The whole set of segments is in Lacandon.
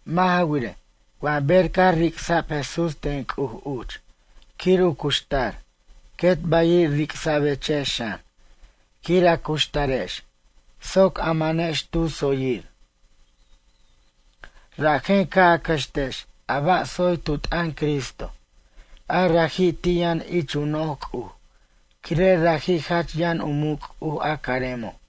Mʌ' ja wirej, wa ber caj ric'sa'b Jesús ten C'uj uch quir u cuxtar quet bayiri' ric'sa'bechex xan, quir a cuxtarex soc a manex tu tsoyir. Rajen ca' a cʌxtex a ba' tsoy tu t'ʌn Cristo, a raji' ti' yʌn ich u noj C'uj quire' raji' jach yʌn u muc' C'uj a caremo'.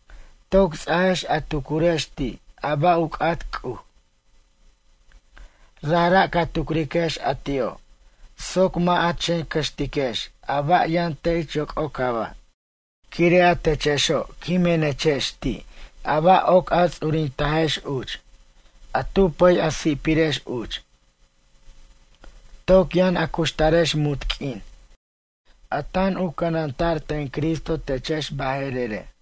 Toc ts'ajex a tucurex ti' a ba' u c'at C'uj. Rajra' ca' tucriquex a ti'o' soc mʌ' a chen cʌxtiquex a ba' yʌn te' ich yoc'ocaba'. Quire' a techexo' quimenechex ti' a ba' oc a ts'urintajex uch, a tu pʌy a si'pirex uch. Toc yʌn a cuxtarex munt q'uin a tan u cʌnanta'r ten Cristo techex baje'rere'.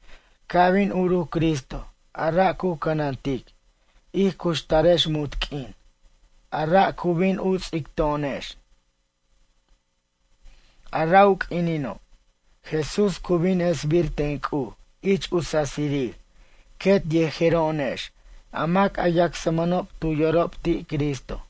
Ca' bin uruc Cristo a ra' cu cʌnantic, ij cuxtarex munt q'uin, a ra' cu bin u ts'ic to'onex. A ra' u q'uinino', Jesús cu bin esbir ten C'uj ich u sasirir quet yejero'onex a mac a yacsmʌnob tu yorob ti' Cristo.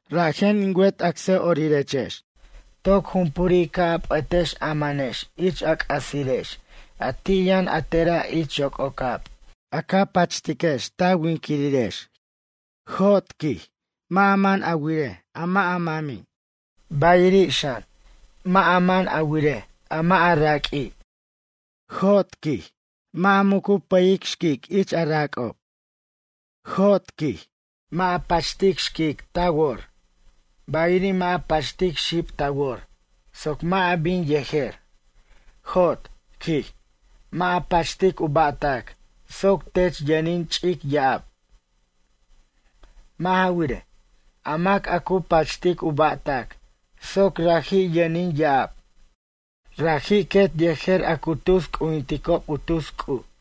Rajen, in wet acsʌ'orirex, toc jumpuri' ca' a p'ʌtex a manex ich a c'asirex a ti' yʌn a tera' ich yoc'ocab a ca pachtiquex ta winquirirex. Jot, quij, mʌ' a man a wirej a mʌ' u mami', bayiri' xan a mʌ' man a wirej a mʌ' a raq'ui', quij. Jot, mʌ' a muc a pʌyej xquic ich u rac'ob. Jot, quij, mʌ' a pachtic xquic ta wor, bayiri' mʌ' a pachtic xib ta wor soc mʌ' a bin yejer. Jot, quij, mʌ' a pachtic u ba'tac soc tech yʌnin ch'ic ya'ab. Mʌ' ja wirej, a mac a cu pachtic u ba'tac soc raji' yʌnin ya'ab, raji' quet yejer a cu tus c'ujinticob u tus c'uj.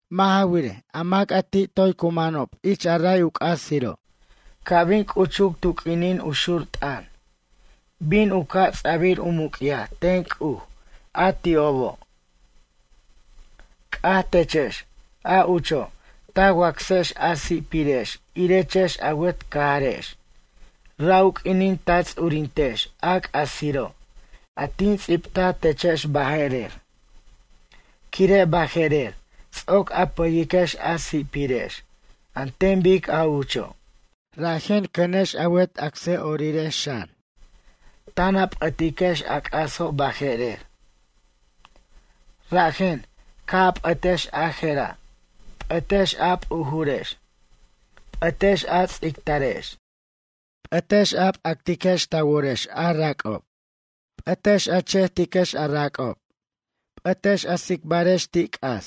Mʌ' ja wirej, a mac a ti' toy cu manob ich a ray u c'asiro', ca' bin c'uchuc tu q'uinin u xur t'ʌn, bin u ca' ts'a'bʌr u muc'yaj ten C'uj a ti'obo'. C'aj techex, a ucho' ta wacsex a si'pirex irechex a wet cajarex, ra' u q'uinin ta ts'urintex a c'asiro' a tin ts'ibtaj techex baje'rer. Quire' baje'rer, ts'oc a pʌyiquex a si'pirex an ten bic a ucho', rajen cʌnex a wet acsʌ'orirex xan, tan a p'ʌtiquex a c'aso' baje'rer. Rajen, ca' a p'ʌtex a je'ra', p'ʌtex a p'ujurex. P'ʌtex a ts'ictarex. P'ʌtex a p'actex ta worex a rac'ob. P'ʌt a chejtiquex a rac'ob. P'ʌt a tsicbarex ti' c'as.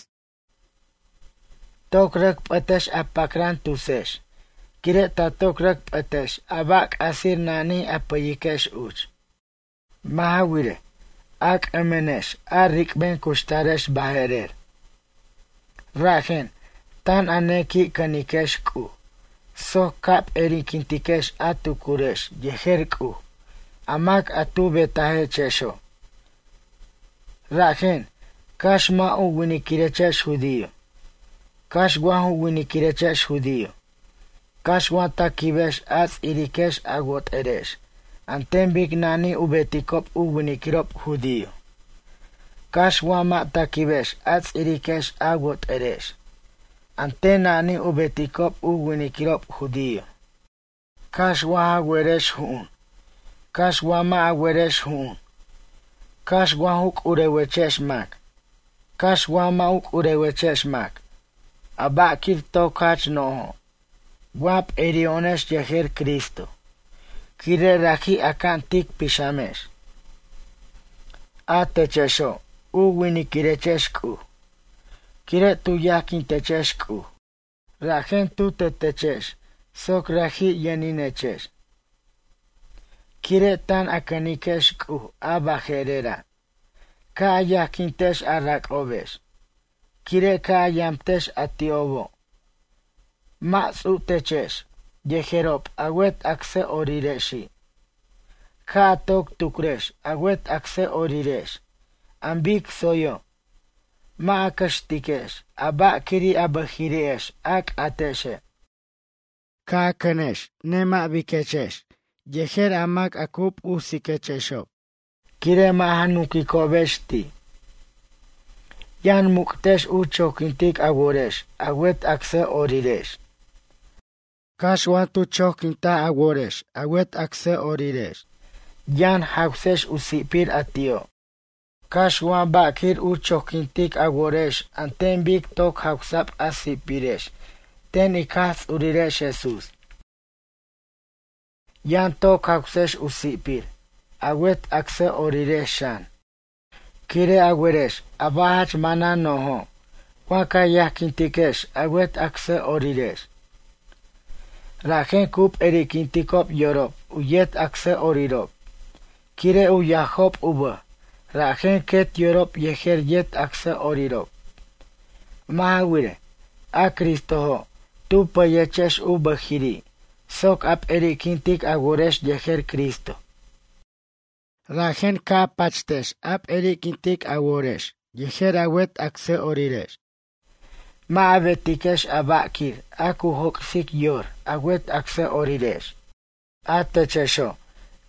Toc rʌc p'ʌtex a pacran tusex, quire' ta toc rʌc p'ʌtex a ba' c'asir nani a pʌyiquex uch. Mʌ' ja wirej, a c'ʌmʌnex a ric'ben cuxtarex baje'rer, rajen tan a nequi' cʌniquex C'uj soc ca p'eri'quintiquex a tucurex yejer C'uj a mac a tu betajechexo'. Rajen cax mʌ' u winiquirechex judío, cax wa ju winiquirechex judío, cax wa ta quibex a ts'iriquex a wot'erex an ten nani u beticob u winiquirob judío, cax wa mʌ' ta quibex a ts'iriquex a wot'erex an ten nani u beticob u winiquirob judío, cax wa ja werex ju'un, cax wa mʌ' a werex ju'un, cax wa ju c'urewechex mac, cax wa mʌ' u c'urewechex mac, a ba'quir toc jach nojo' wa p'eri'o'onex yejer Cristo quire' raji' aca'an tic pixamex. A techexo' u winiquirechex C'uj. Quire' tu yajquintechex C'uj rajen tu tetechex soc raji' yʌninechex. Quire' tan a cʌniquex C'uj a baje'rera', ca' a yajquintex a rac'obex, quire' ca' a yamtex a ti'obo', mʌ' ts'utechex yejerob a wet acsʌ'orirexi'. Ca' a toc tucrex a wet acsʌ'orirex an bic tsoyo', mʌ' a cʌxtiquex a ba'quiri' a bʌjiri'ex a c'atexe'. Ca' a cʌnex nemʌ' biquechex yejer a mac a cu p'usiquexob, quire' mʌ' ja nunquicobex ti'. Yʌn muc'tex u choquintic a worex a wet acsʌ'orirex. Cax wa tu choquint a worex a wet acsʌ'orirex, yʌn jawsex u si'pir a ti'o', cax wa ba'quir u choquintic a worex an ten bic toc jawsa'b a si'pirex ten ic Jaj Ts'urirex Jesús. Yʌn toc jawsex u si'pir a wet acsʌ'orirex xan. Quire' a werex a ba' jach manan no'jo' wa ca yajquintiquex a wet acsʌ'orirex. Rajen cu p'eri'quinticob yorob u yet acsʌ'orirob quire' u yajob u bʌj rajen quet yorob yejer yet acsʌ'orirob. Mʌ' ja wirej, a Cristojo' tu pʌyechex u bʌjiri' soc a p'eri'quintic a worex yejer Cristo. Rajen ca' a pachtex a p'eri'quintic a worex yejer a wet acsʌ'orirex. Mʌ' a betiquex a ba'quir a cu joc'sic yor a wet acsʌ'orirex. A techexo',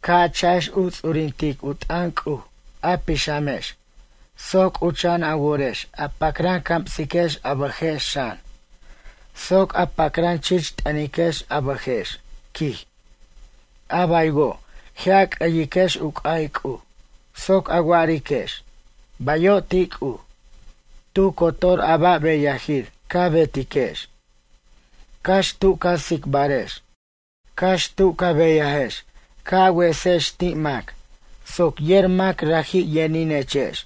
ca' a cha'ex u ts'urintic u t'ʌn C'uj a pixamex soc c'ucha'an a worex a pacran camsiquex a bʌjex xan, soc a pacran chich t'ʌniquex a bʌjex, quij, a baywo' je' a c'ʌyiquex u c'ay C'uj, soc a wa'ariquex: “Bayo' ti' C'uj.” Tu cotor a ba' beyajir ca betiquex, cax tu ca ts'icbarex, cax tu ca beyajex ca' a wesex ti' mac soc yer mac raji' yʌninechex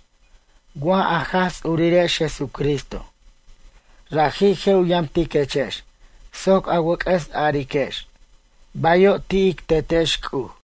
wa a Jaj Ts'urirex Jesucristo. Raji' je' u yamtiquechex soc a wʌc'ʌs ariquex: “Bayo' ti' ic Tetex C'uj.”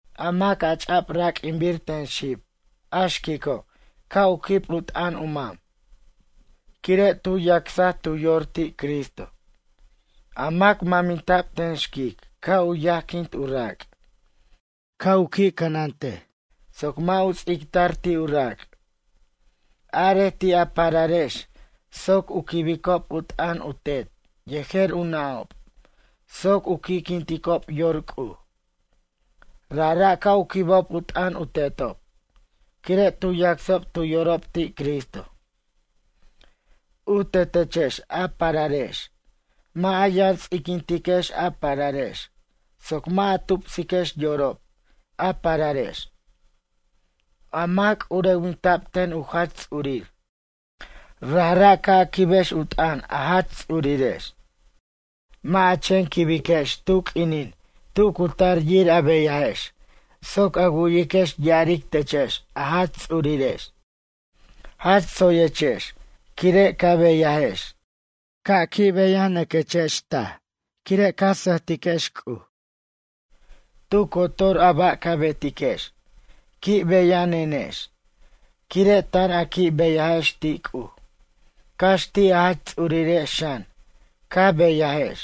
A mac a ch'a'b raq'uinbir ten xib, a xquico' ca' u quib u t'ʌn u mam, quire' tu yacsaj tu yor ti' Cristo. A mac maminta'b ten xquic ca' u yajquint u rac', ca' u qui' cʌnantej soc mʌ' u ts'ictar ti' u rac'. Arej ti' a pararex, soc u quibob u t'ʌn u tet yejer u nʌ'ob soc u qui'quinticob yor C'uj. Rajra' ca' u quibob u t'ʌn u tetob, quire' tu yacsob tu yorob ti' Cristo. U tetechex a pararex, mʌ' a yʌn ts'iquintiquex a pararex soc mʌ' a tupsiquex yorob a pararex. A mac c'urewinta'b ten u jach ts'urir. Rajra' ca' a quibex u t'ʌn a jach ts'urirex. Mʌ' a chen quibiquex tu q'uinin tu cu tar yir a beyajex soc a wu'yiquex ya'aric techex a jach ts'urirex: “Jach tsoyechex quire' ca beyajex.” Ca' a qui' beyanʌquechex taj quire' ca sʌjtiquex C'uj. Tu cotor a ba' ca betiquex, qui' beyanenex quire' tan a qui' beyajex ti' C'uj, cax ti' a jach ts'urirex xan ca beyajex.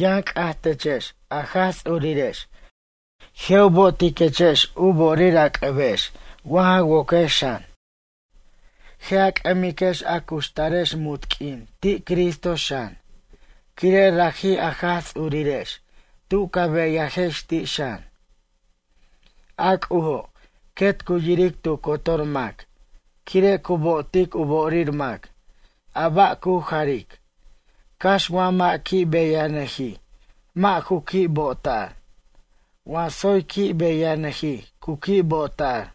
Yʌn c'aj techex a Jaj Ts'urirex je' u bo'otiquechex u bo'orir a c'ʌbex wa ja woquex xan. Je' a c'ʌmiquex a cuxtarex munt q'uin ti' Cristo xan, quire' raji' a Jaj Ts'urirex tu ca beyajex ti' xan. A C'ujo' quet cu yiric tu cotor mac, quire' cu bo'otic u bo'orir mac, a ba' cu jaric, cax wa mʌ' qui' beyanʌji' mʌ' ju qui' bo'tar. Wa tsoy qui' beyanʌjij cu qui' bo'ta'r.